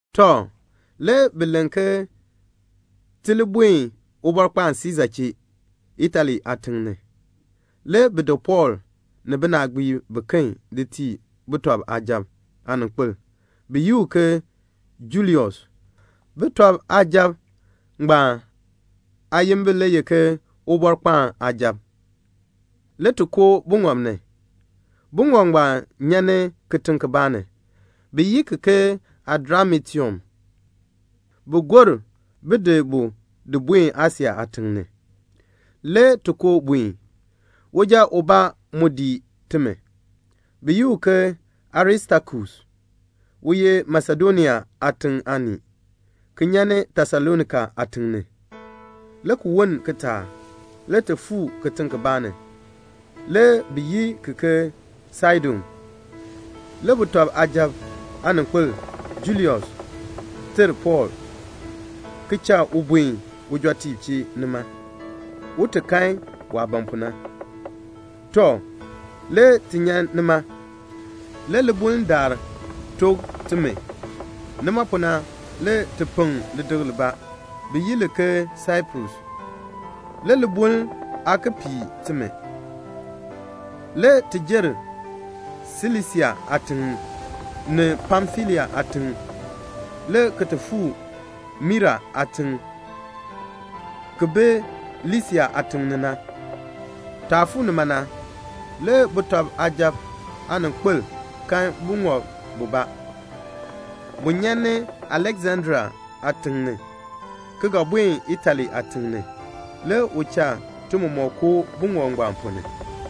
Tɔ, le bi len ke ti li buen Ubɔrkpaan Siisa chee, Itali aatiŋ ni. Le bi di Pɔɔl ni binaagbiib biken di tii sujatiib aaninkpil bi yi u ke Julius. Sujatiib ngbaan aayimbil le ye ke "Ubɔrkpaan aasujatiib." Le ti koo buŋɔb ni. Buŋɔb ngbaan nyan ni kitiŋ kibaa ni, bi yi ki ke Adramitium. Bi gor bin di bu di buen Asia aatiŋ ni. Le ti koo buen. Uja ubaa mu dii timi, bi yi u ke Aristakus. U ye Masedonia aatiŋ aanii, ki nyan Tesalonika aatiŋ ni. Le ki woln kitaak, le ti fuu kitiŋ kibaa ni, le bi yi ki ke Saidon. Le sujatiib aaninkpil Julius ter Pɔɔl, ki cha u buen ujɔtiib chee nima, un ti kan waah ban pu na. Tɔ, le ti nyan nima. Le libuln daar took timi. Nima pu na, le ti peŋ lidikl libaa, bi yi li ke Saiprus. Le libuln aa ki pii timi. Le ti jer Silisia aatiŋ, ni Pamfilia aatiŋ, le ki ti fuu Mira aatiŋ ki bi Lisia aatiŋ ni. Taah fuu nima na, le sujatiib aaninkpil kan buŋɔb bubaa. Bu nyan ni Aleksandria aatiŋ ni, ki ga buen Itali aatiŋ ni. Le u cha ti mɔmɔk koo buŋɔb ngbaan ponn ni.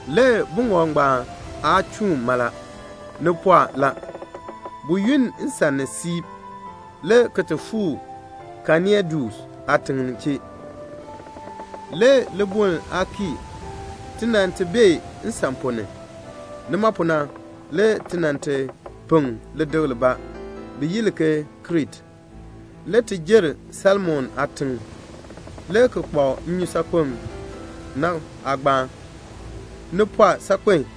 Le buŋɔb ngbaan aa chuun mala. Ni pɔɔ la. Bu yunn nsan ni siib, le ki ti fuu Kenaidus aatiŋ chee. Le libuln aa kii ti nan ti bee nsan ponn ni. Nima pu na, le ti nan ti peŋ lidikl libaa, bi yi li ke Krete. Le ti jer Salmone aatiŋ, le ki kpak nnyusaakpem na aagbaan. Ni pɔɔ saakpen a.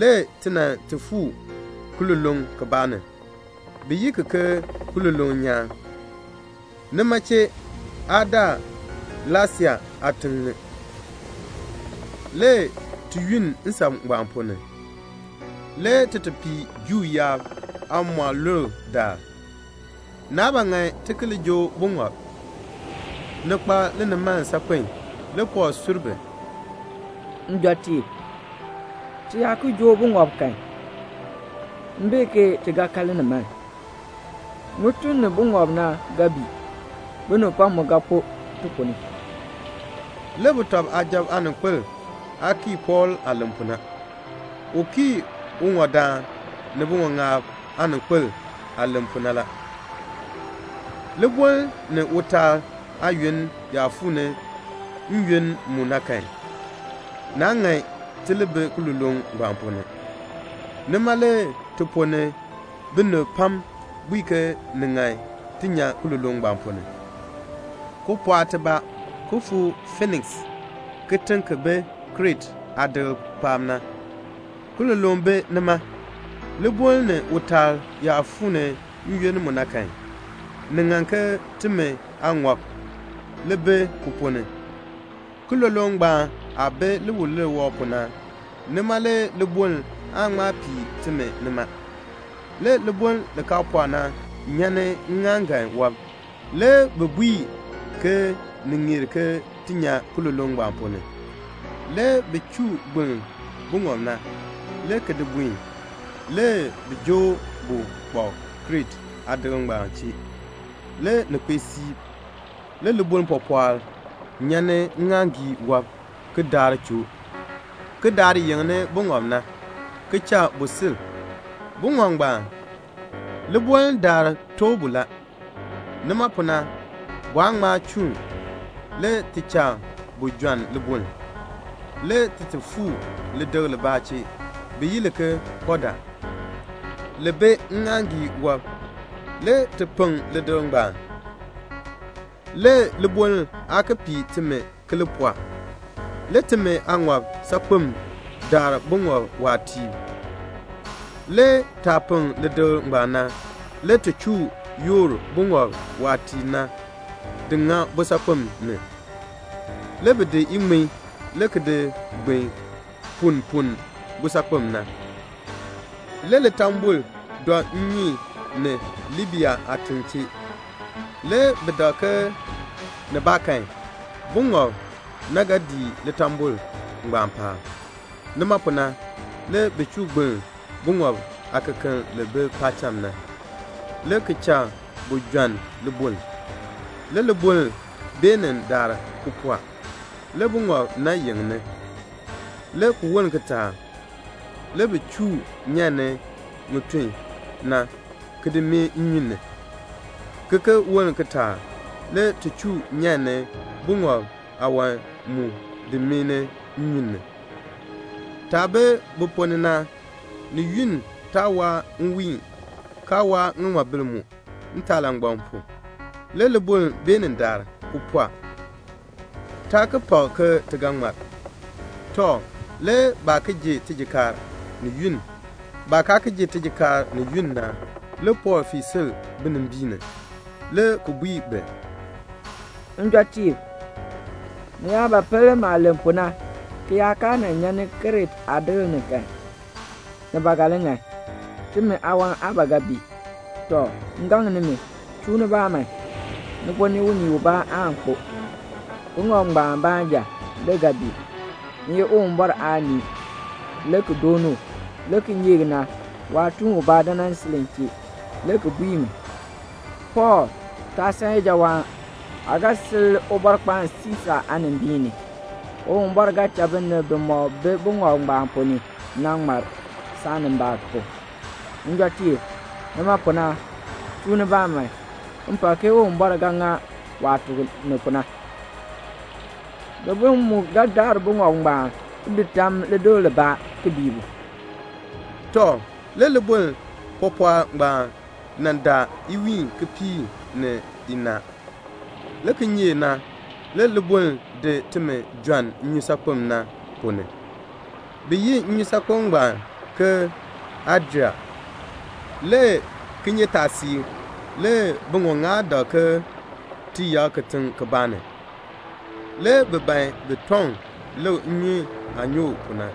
Le ti nan ti fuu kiloloŋ kibaa ni, bi yi ki ke Kiloloŋ Nyaan. Nima chee aa daa Lasea aatiŋ ni. Le ti yunn nsan ngbaan ponn ni, le ti ti pii Juu yaab aamɔlulb daal. Naa ba ŋan ti ki li joo buŋɔb. Ni kpa linimaln saakpen. Le Pɔɔl sur bi, "Njɔtiib, ti yaa ki joo buŋɔb kan, m bee ke ti ga kan linimaln. Ŋitun ni buŋɔb na ga bii. Binib pam mu ga kpo ti ponn ni." Le sujatiib aaninkpil aa kii Pɔɔl aah len pu na. U kii uŋɔdaan ni biŋɔŋaab aaninkpil aah len pu na la. Libuln ni utaal aayoonn yaa fuu ni n-yoonn mu na kan, naa ŋan ti li bi kiloloŋ ngbaan ponn ni. Nima le ti ponn ni binib pam bui ke ni ŋan ti nyan kiloloŋ ngbaan ponn ni, ki pɔɔk tibaa ki fuu Fiiniks, kitiŋ ki bi Krete aadikl paab na. Kiloloŋ bi nima. Libuln ni utaal yaa fuu ni n-yoonn mu na kan, ni ŋan ke timi aaŋɔb li bi ki ponn ni. Kiloloŋ ngbaan aah bi liwilir wɔb pu na, nima le libuln aan ŋma pii timi nima. Le libuln li kaa pɔɔ na nyan ni ŋŋaaŋgan wɔb. Le bi bui ke ni ŋeer ke ti nyan kiloloŋ ngbaan ponn ni. Le bi chuu gbiln buŋɔb na, le ki di buen. Le bi joo bu kpak Krete aadikl ngbaan chee. Le ni kpee siib, le libuln pɔpɔɔl nyan ni ŋŋaaŋgii wɔb ki daar choo, ki daar yeŋni buŋɔb na, ki cha bu sil. Buŋɔb ngbaan, libuln daar tooh bu la. Nima pu na, bu aa ŋma chuun. Le ti cha bu jɔnn libuln. Le ti ti fuu lidikl libaa chee, bi yi li ke Kɔda, li bi ŋŋaaŋgii wɔb. Le ti peŋ lidikl ngbaan, le libuln aa ki pii timi ki li pɔɔ. Le timi aaŋɔb saakpem dar buŋɔb waatiib. Le taah peŋ lidikl ngbaan na, le ti chuu yoor buŋɔb waatiib na di ŋa busaakpem ni. Le bi di iŋmin le ki di gbin punn punn busaakpem na. Le litambol dɔ nnyun ni Libia aatiŋ chee. Le bi dak ke nibaakan buŋɔb na ga dii litambol ngbaan paab. Nima pu na, le bi chuu gbiln buŋɔb aakekeln li bi paacham na, le ki cha bu jɔnn libuln. Le libuln beenin daar ki pɔɔ, le buŋɔb na yeŋni. Le ki woln kitaak, le bi chuu nyan ni ŋitun na ki di mee nnyun ni; ki ki woln kitaak, le ti chuu nyan ni buŋɔb aawan mu di mee ni nnyun ni. Taah bi bu ponn ni na, ni yunn taa waa nwiin, kaa waa ŋiŋmabil mu, ntaalangbam pu. Le libuln beenin daar, ki pɔɔ. Taa ki pak ke ti ga ŋmar. Tɔ, le baa ki ji tijikaar, ni yunn. Baah kaa ki ji tijikaar ni yunn na, le Pɔɔl fii sil binimbiin ni, le ki bui bi, "Njɔtiib, ni yaa ba pel maah nan len pu na, ki yaa kaa nan nyan ni Krete aadikl ni kan, ni ba ga li ŋan. Timi aawan aa ba ga bii. Tɔ, m gaŋ nimi, chuu nibaa man. Ti ponn ni unii ubaa aan kpo. Buŋɔb ngbaan baanja le ga bii. M ye Uwumbɔr aanii, le ki dooni u. Le kinyeek na, waatuun ubaa dan nan sil m chee, le ki bui mi, 'Pɔɔl, taa san ijawaan. Aa ga sil Ubɔrkpaan Siisa aanimbiin ni. Uwumbɔr ga cha binib bimɔk bi buŋɔb ngbaan ponn ni na ŋmar, saanimbaak pu.' Njɔtiib, nima pu na, chuu nibaa man. M pak ke Uwumbɔr ga ŋa waah tuk mi pu na. Libuln mu ga daar buŋɔb na ti di tam lidikl libaa, ki bii bu." Tɔ, le libuln pɔpɔɔl ngbaan nan daar iwiin kipiik ni inaa. Le kinyeek na, le libuln di timi jɔnn nnyusaakpem na ponn ni. Bi yi nnyusaakpem ngbaan ke Adria. Le kinyeetaasiik, le biŋɔŋaab dak ke ti yak kitiŋ kibaa ni. Le bi ban bin tɔŋ lik ke nnyun aah nyoo pu na.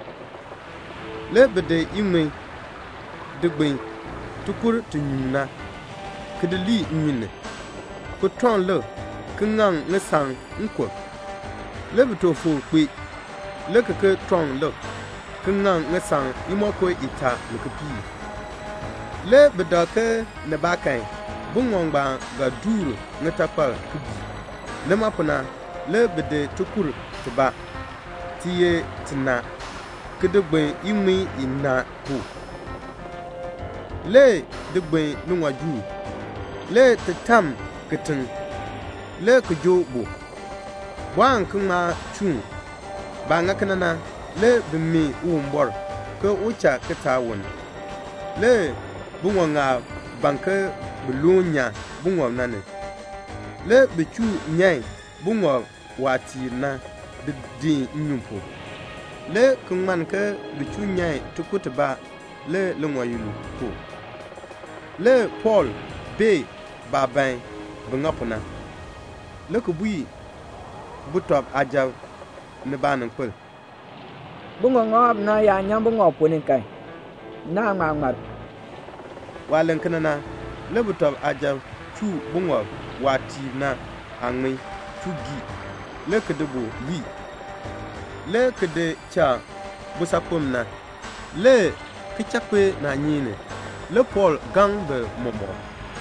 Le bi di ŋŋmin di gbin tikur ti nyuun na, ki di lii nnyun ni, ki tɔŋ lik, ki ŋaŋ ŋisaŋ nkub. Le bi took foor kpee, le ki ki tɔŋ lik, ki ŋaŋ ŋisaŋ imonko itaa ni kipiik. Le bi dak ke nibaakan buŋɔb ngbaan ga duur ŋitakpal ki bii. Nima pu na, le bi di tikur tibaa, ti ye tinaa, ki di gbin iŋmin inaa pu, le di gbin liŋɔjuul, le ti tam kitiŋ, le ki joo bu. Bu aan ki ŋma chuun. Baah ŋa kena na, le bi mee Uwumbɔr ke un cha kitaak woln. Le biŋɔŋaab ban ke bin loon nyan buŋɔb na ni. Le bi chuu nyan buŋɔb waatiib na di deen nnyun pu, le ki ŋmann ke bi chuu nyan tikur tibaa le liŋɔyil pu. Le Pɔɔl bee baah ban bin ŋa pu na, le ki bui sujatiib ni baaninkpil, "Biŋɔŋaab na yaa nyan buŋɔb na ponn ni kan, naan ŋma ŋmar." Waah len kena na, le sujatiib chuu buŋɔb waatiib na aaŋmin chuu gii, le ki di bu lii, le ki di cha busaakpem na. Le kichakpinaanyeek ni le Pɔɔl gaŋ bi mɔmɔk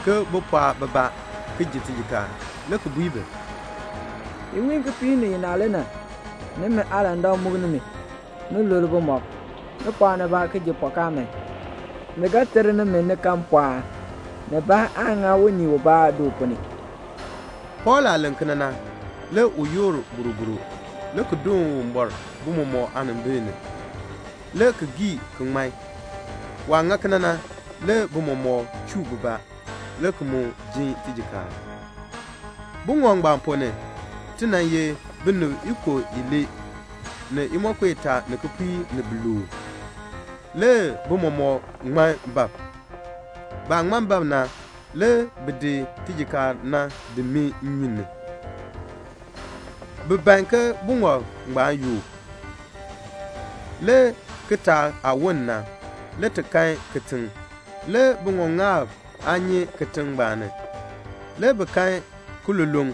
ke bin pɔɔk bibaa ki ji tijikaar, le ki bui bi, "Iwiin kipiik ni inaa le na, nimi aalandak muk nimi, ni lul bumɔb. Ni pɔɔk nibaa ki ji pɔkaa man. Ni ga ter nimi, ni kan mpɔɔn. Nibaa aan ŋa unii ubaa du ponn ni." Pɔɔl aah len kena na, le u yoor boroboro, le ki doon Uwumbɔr bi mɔmɔk aanimbil ni, le ki gii ki ŋman. Waah ŋa kena na, le bi mɔmɔk chuu bibaa, le ki mu jin tijikaar. Buŋɔb ngbaan ponn ni, ti nan ye binib ikub ilee ni imonko itaa ni kipiik ni biluub. Le bi mɔmɔk ŋman bab. Baah ŋman bab na, le bi di tijikaar na di mee nnyun na ni. Bi ban ke buŋɔb ngbaan yook. Le kitaak aah woln na, le ti kan kitiŋ. Le biŋɔŋaab aa nyi kitiŋ ngbaan ni. Le bi kan kiloloŋ.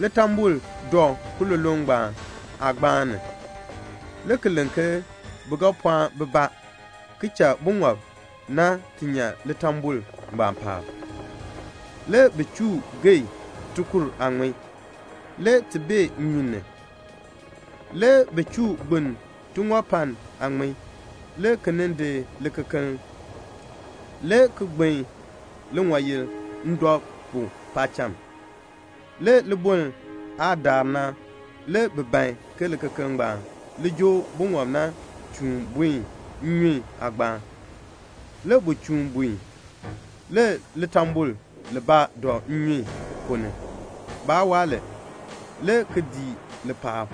Litambol dɔ kiloloŋ ngbaan aagbaan ni. Le bi len ke bi ga pɔɔn bibaa ki cha buŋɔb na ti nyan litambol ngbaan paab. Le bi chuu geei tikur aaŋmin, le ti bee nnyun ni. Le bi chuu gbiln tiŋɔpann aaŋmin, le ki nin di likekeln, le ki gbin liŋɔyil ndɔ pu paacham. Le libuln aah daar na, le bi ban ke likekeln ngbaan li joo buŋɔb na chuun buen nnyun aagbaan. Le bu chuun buen. Le litambol libaa dɔ nnyun ponn ni. Baa waa li, le ki dii li paab.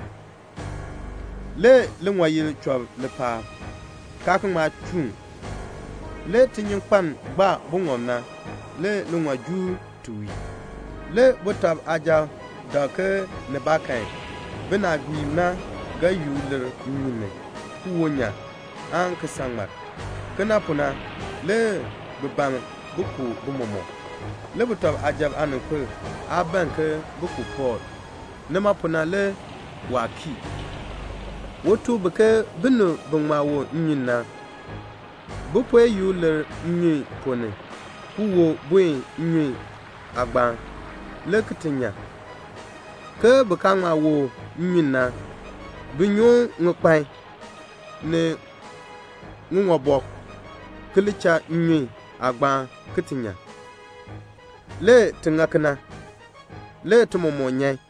Le liŋɔyil chɔb li paab, kaan ki ŋma chuun. Le tinyunkpeln gbaa buŋɔb na le liŋɔjuul ti wii. Le sujatiib dak ke nibaakan binaagbiib na ga yuk lir nnyun ni, ki wo nyan, aan ki san ŋmar. Kena pu na, le bi ban bin ku bi mɔmɔk. Le sujatiib aaninkpil aa ban ke bi ku Pɔɔl; nima pu na le waa kii. U tuk bi ke binib bi ŋma wo nnyun na, bin puen yuk lir nnyun ponn ni, ki wo buen nnyun ngbaan, le ki ti nyan; ke bin kaa ŋma wo nnyun na, bin nyoon ŋikpan, ni ŋiŋɔbɔk, ki li cha nnyun ngbaan, ki ti nyan. Le ti ŋa kena. Le ti mɔmɔk nyan.